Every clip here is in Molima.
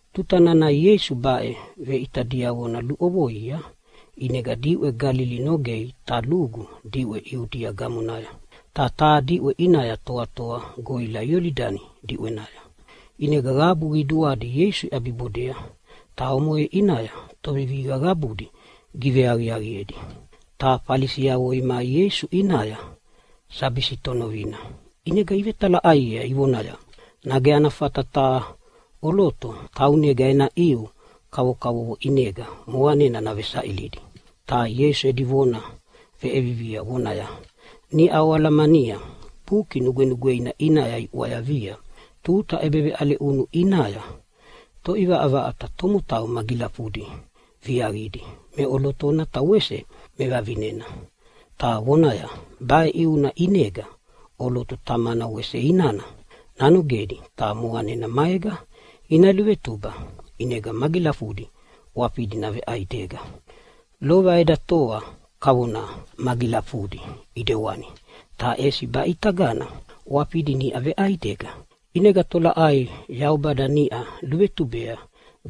Tuta nana Ieisu baʼe veʼita diavona luʼovoia, ʼinega diʼwe Galili nogei ta lugu diʼwe Iudia gamonaya, ta taha diʼwe ʼinaya toatoa goʼila Iolidani diʼwenaya. ʼInega qabu qiduadi Ieisu iʼabibodea, ta omoʼe ʼinaya tovevihiqa qabudi giveaqiaqiedi. Ta Falisiavo imai Ieisu ʼinaya sabi sitonovina, ʼinega ivetalaʼaiea ivonaya, “Nage ana fata taha ʼoloto taunega ena ʼiu kavokavovo ʼinega moqanena navesaʼilidi?” Ta Ieisu edi vona veʼevivia vonaya, “Niʼa oalamania Buki Nugwenugweina ʼinaya iʼwayavia tuta ʼebeveʼale ʼunu ʼinaya Toʼivaʼavaʼata tomotau magilafudi viaqidi meʼolotona ta wese mevavinena”, ta vonaya, “Baʼe ʼiuna ʼinega ʼoloto tamana wese inana nanogedi ta moqanena maega ina luvetuba, ʼinega magilafudi ʼwafidi naveʼaidega. Lova edi toa kavona magilafudi ʼidewani, ta ʼesi baʼitagana ʼwafidi niʼa veʼaidega, ʼinega tolaʼai Yaubada niʼa luvetubea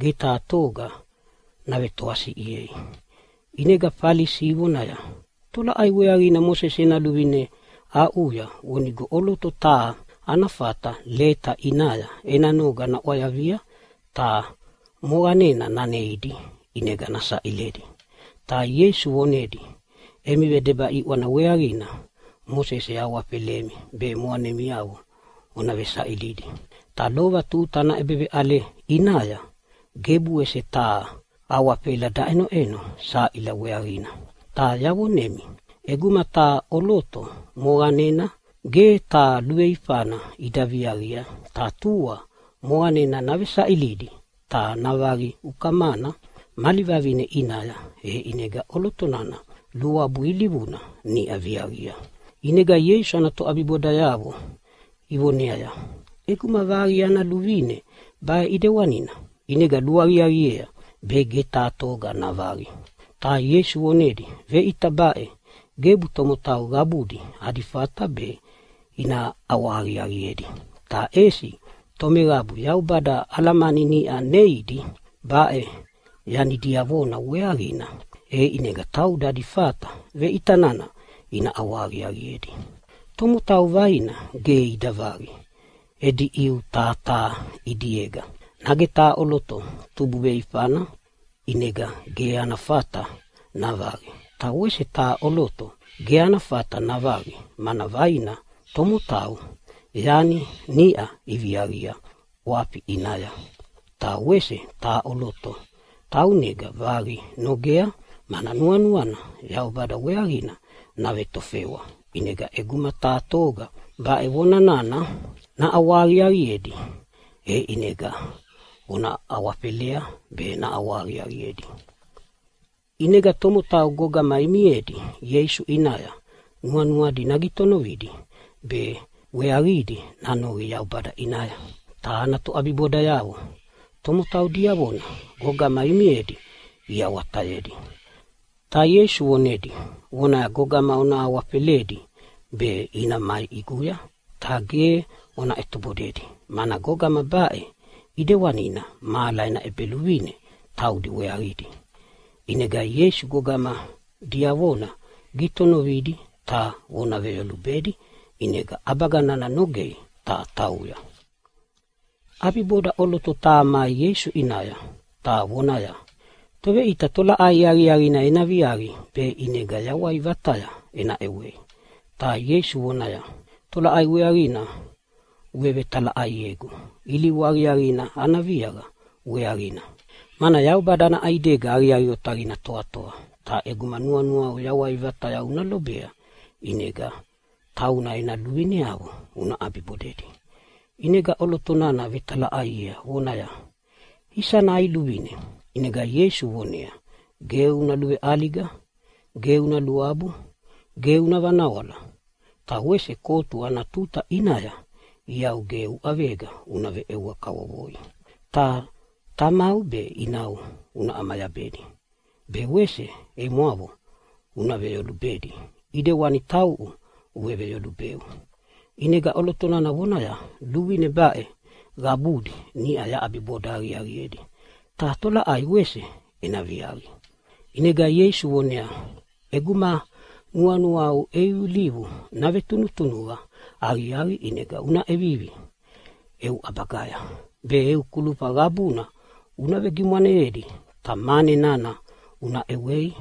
ge taha toga navetoasiʼiei.” ʼInega Falisi ivonaya, “Tolaʼai weaqina Mosese ena luvine aʼuya vonigo ʼoloto taha ana fata leta ʼinaya ena noga naʼwayavia ta moqanena naneidi ʼinega nasaʼiledi?” Ta Ieisu vonedi, “Emi vedeba ʼiʼwana weaqina Mosese awafelemi be moqanemiavo ona vesaʼilidi. Ta lova tuta ana ʼebeveʼale ʼinaya gebu wese taha awafela daʼenoʼeno saʼila weaqina. Ta yavonemi, ʼeguma taha ʼoloto moqanena ge taha luveifana ida viaqi ta tua moqanena navesaʼilidi ta navaqi ukamana mali vavine ʼinaya, e ʼinega ʼoloto nana luabu ilivuna niʼa viaqia.” ʼInega Ieisu ana toʼabibodayavo ivoneaya, “ʼEguma vaqi ana luvine baʼe ʼidewani ʼinega luaqiaqiea be ge taha toga navaqi.” Ta Ieisu vonedi, “Veʼita baʼe gebu tomotau qabudi adi fata be ina ʼawahaqiaqiedi, ta ʼesi tomeqabu Yaubada alamani niʼa neidi baʼe yani diavona weaqina, e taudi adi fata veʼita nana ina ʼawahaqiaqiedi. Tomotau vaina ge ida vaqi edi ʼiu taha taha ʼidiega. Nage taha ʼoloto tubu veiveifana ʼinega ge ana fata navaqi, ta wese taha ʼoloto ge ana fata navaqi mana vaina tomotau yani niʼa iviaqia ʼwafina ʼinaya. Ta wese taha ʼoloto taunega vaqi nogea, mana nuanuana Yaubada weaqina navetofewa. ʼInega ʼeguma taha toga baʼe vona nana naʼawahaqiaqiedi e ʼinega ona awafelea be naʼawahaqiaqiedi.” ʼInega tomotau gogama imiedi Ieisu ʼinaya nuanuadi nagitonovidi be weaqidi nanoqi Yaubada ʼinaya. Ta ana toʼabibodayavo tomotau diavona gogama imiedia iawatayedi. Ta Ieisu vonedi vonaya, “Gogama ona awafeledi be ina mai ʼiguya, ta ge ona ʼetobodedi, mana gogama baʼe ʼedewanina mahala ena ʼEbeluvine taudi weaqidi.” ʼInega Ieisu gogama diavona gitonovidi ta vona veyolubedi, ʼinega ʼabaga nana nogei ta tauya. ʼAbiboda ʼoloto taha mai Ieisu ʼinaya ta vonaya, “Toveʼita, tolaʼai aqiaqina ena viaqi be ʼinega yawai vataya ena ʼewei?” Ta Ieisu vonaya, “Tolaʼai weaqina uvevetalaʼaiegu ilivu aqiaqina ana viaqa weaqina? Mana Yaubada ana ʼaidega aqiaqi otaqina toatoa, ta ʼeguma nuanuau yawai vataya una lobea ʼinega tauna ena luvineavo una ʼabibodedi.” ʼInega ʼoloto nana vetalaʼaiea vonaya, “Isana ʼai luvine?” ʼInega Ieisu vonea, “Ge una luveʼaliga, ge una luabu, ge una vanawala, ta wese kotu ana tuta ʼinaya iau ge uʼavega una veʼewa kavovoi. Ta tamau be inau una ʼamayabedi, be wese emwavo una veyolubedi ʼidewani tauʼu uveveyolubeu.” ʼInega ʼoloto nana vonaya, “Luvine baʼe qabudi niʼa yaʼabiboda aqiaqiedi, ta tolaʼai wese ena viaqi?” ʼInega Ieisu voneaya, “ʼEguma nuanuau eu ilivu navetunutunuqa aqiaqi ʼinega una ʼevivi eu ʼabagaya be eu kulufa qabudi una vegimwaneyedi. Ta mane nana una ʼewei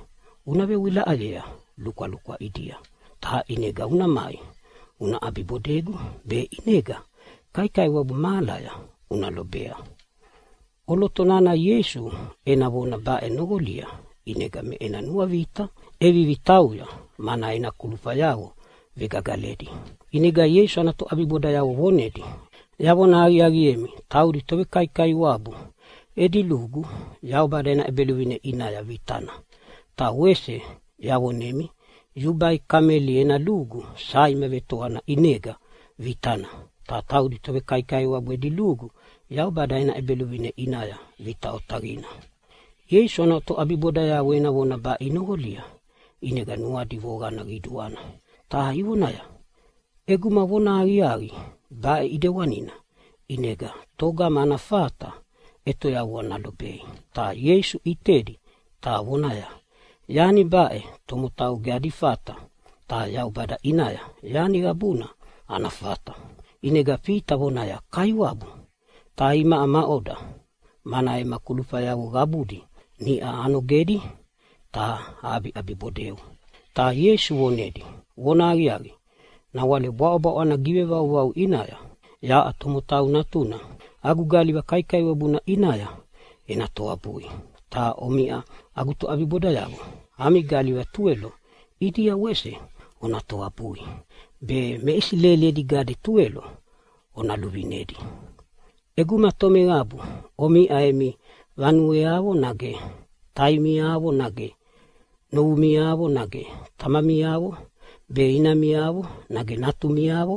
una vewilaʼayea lukwalukwa ʼidia, ta ʼinega una mai una ʼabibodegu, be ʼinega kaikaiwabu mahalaya una lobea.” ʼOloto nana Ieisu ena vona baʼe noqolia ʼinega me ena nuavita ʼevivi tauya, mana ena kulufayavo vegagaledi. ʼInega Ieisu ana toʼabibodayavo vonedi, “Yavona aqiaqiemi, taudi tovekaikaiwabu edi lugu Yaubada ena ʼEbeluvine ʼinaya vitana. Ta wese yavonemi yubai kameli ena lugu saima vetoana ʼinega vitana, ta taudi tovekaikaiwabu edi lugu Yaubada ena ʼEbeluvine ʼinaya vita otaqina.” Ieisu ana toʼabibodayavo ena vona baʼe inoqolia ʼinega nuadi voqana qiduana ta ivonaya, “ʼEguma vonahaqiaqi baʼe ʼidewanina, ʼinega togama ana fata ʼetoyavua nalobei?” Ta Ieisu ʼitedi ta vonaya, “Yani baʼe tomotau ge adi fata, ta Yaubada ʼinaya yani qabuna ana fata!” ʼInega Fita vonaya, “Kaiwabu, ta imaʼa maʼoda, mana ema kulufayavo qabudi niʼau anogedi ta aʼabiʼabibodeu?” Ta Ieisu vonedia, “Vonahaqiaqi, nawale bwaʼobwaʼo ana givevauvau ʼinaya yaʼa Tomotau Natuna agu galiva kaikaiwabuna ʼinaya ena toabui. Ta omiʼa agu toʼabibodayavo ami galiva tuwelo ʼidia wese ona toabui, be me Isileli edi gade tuwelo ona luvinedi. “ʼEguma tomeqabu omiʼa emi vanueavo nage taimiavo nage novumiavo nage tamamiavo be inamiavo nage natumiavo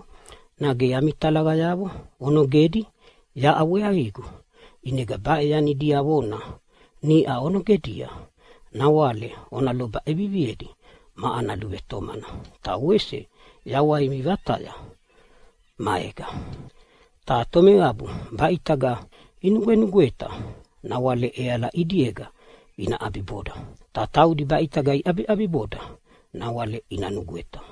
nage ami talaqayavo onogedi yaʼa weaqigu, ʼinega baʼe yani diavona niʼa onogedia nawale ona loba ʼeviviedi ma ana luvetomana, ta wese yawaimi vataya maega. Ta tomeqabu baʼitaga inugwenugweta nawale ʼeala ʼidiega ina ʼabiboda, ta taudi baʼitaga iʼabiʼabiboda nawale ina nugweta.